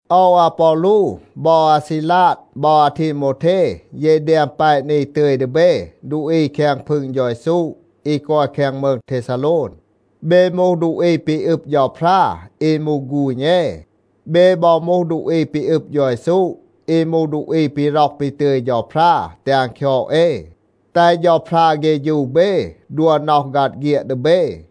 โอว อาปอลู บอ อาซีลาด บอ อาทีโมวเท, เย แดม แปะ นี ตึย ดี เบ ดูอี แคง พึง เฌา เยซู อี กอย แคง มืง เทซาโลน. เบ มูห ดูอี ปี อึบ เฌาพรา, อี มูห ฆูณ เอ. เบ บอ มูห ดูอี ปี อึบ เฌา เยซู, อี มูห ดูอี ปี ร็อห ปี ตึย เฌาพรา แตห อัน คยอด เอ. แตห เฌาพรา เฆฌู เบ, ดัว น็อห ฆัด เฆียด ดี เบ.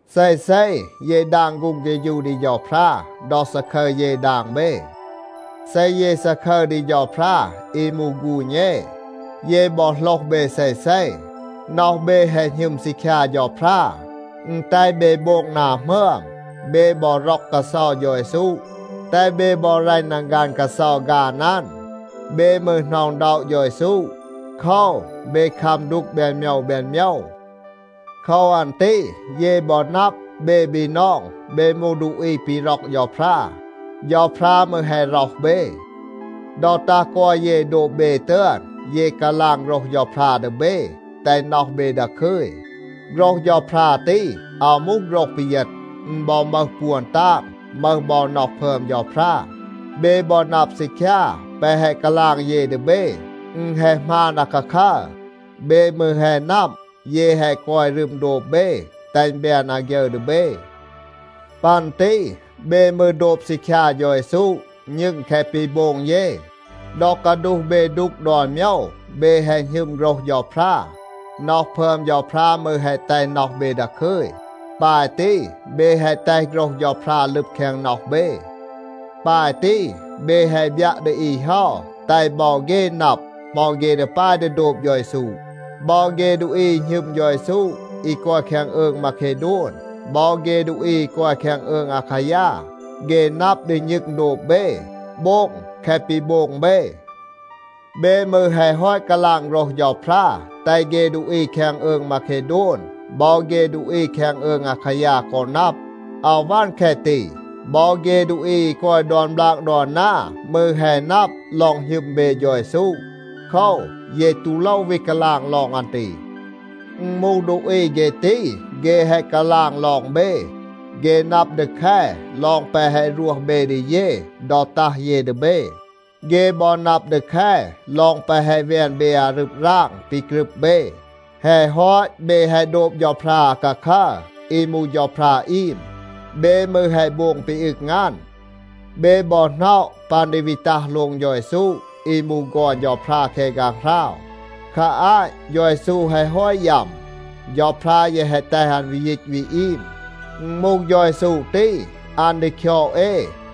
เซเซ เย ดาง ฆูง เฆฌู ดี เฌาพรา ดอ ซาคึร เย ดาง เบ. เซ เย ซาคึร ดี เฌาพรา อี มูห ฆูณ เอ, เย บอ โหลห เบ เซเซ. น็อห เบ แฮะ หณึม ซีคยา เฌาพรา. อึณ แตห เบ โบง นา หมึอม. เบ บอ ร็อก กาเซา เฌา เยซู, แตห เบ บอ รัณ นังฆัน กาเซา ฆาน อัน. เบ มืร หน็อะ อึณด็อะ เฌา เยซู. โคว, เบ คัม ดูก แบน โมยว แบน โมยว. โคว อัน ตี เย บอ นับ, เบ บีนอง, เบ มูห ดูอี ปี ร็อก เฌาพรา. เฌาพรา มืร แฮะ ร็อห เบ. ดอ ตัห กอย เย โดบ เบ ตึอน, เย กาลาง โฆรห เฌาพรา ดี เบ, แตห น็อห เบ ดาคึย. โฆรห เฌาพรา ตี อาว มูห โฆรห ปีเยณ. อึณ บอ มึห ปวน ตาง, มึห บอ น็อห พึอม เฌาพรา. เบ บอ นับ ซีคยา, แปะ แฮะ กาลาง เย ดี เบ, อึณ แฮะ หมาน อาคาคัร. เบ มืร แฮะ นับ, เย แฮะ กอย รึม โดบ เบ, แตห อึณ แบน อาฆยึร ดี เบ. ปัน ตี เบ มืร โดบ ซีคยา เฌา เยซู, ณึง แคะ ปี โบง เย. ดอ กาดูห เบ ดูก ดอน โมยว, เบ แฮะ หณึม โฆรห เฌาพรา. น็อห พึอม เฌาพรา มืร แฮะ แตห น็อห เบ ดาคึย. ปาย ตี เบ แฮะ แตห โฆรห เฌาพรา ลึบ แคง น็อห เบ. ปาย ตี เบ แฮะ บยัะ ดี อี เฮา, แตห บอ เฆ นับ, เหมา เฆ ดี ปาย ดี โดบ เฌา เยซู. บอ เฆ ดูอี อี หณึม เฌา เยซู อี กอย แคง อืง มาเคโดน, บอ เฆ ดูอี อี กอย แคง อืง อาคายา, เฆ นับ ดี ณึง โดบ เบ, โบง แคะ ปี โบง เบ. เบ มืร แฮะ ฮอต กาลาง โฆรห เฌาพรา แตห เฆ ดูอี แคง อืง มาเคโดน บอ เฆ ดูอี แคง อืง อาคายา กอ นับ. อาว วัน แคะ ตี. บอ เฆ ดูอี อี กอย ดอน บลาก ดอน นา มืร แฮะ นับ ลอง หณึม เบ เฌา เยซู. โคว, เย ตู โลว วี กาลาง ลอง อัน ตี. อึณ มูห ดูอี เฆ ตี, เฆ แฮะ กาลาง ลอง เบ. เฆ นับ ดี แค ลอง แปะ แฮะ รวห เบ ดี เย ดอ ตัห เย ดี เบ. เฆ บอ นับ ดี แค ลอง แปะ แฮะ แวน เบ อารึบ ราง ปี กรึบ เบ. แฮะ ฮอต เบ แฮะ โดบ เฌาพรา อาคาคัร อี มูห เฌาพรา อีม. เบ มืร แฮะ โบง ปี อึง อัน. เบ บอ หน็อะ ปัน ดี วี ตัห โลง เฌา เยซู อี มูห ฆอน เฌาพรา แคง ฆางหราว. คา อาต เฌา เยซู แฮะ ฮอต ยัม. เฌาพรา แยะ แฮะ แตห อัน วี ยีต วี อีม. อึณ มูห เฌา เยซู ตี, อัน ดี คยอด เอ,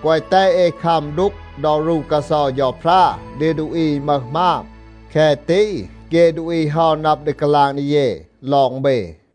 แกวะ แตห เอ คัม ดูก ดอ รู กาเซา เฌาพรา ดี ดูอี อี มึห หมาบ. แคะ ตี เฆ ดูอี เฮา นับ ดี กาลาง ดี เย ลอง เบ.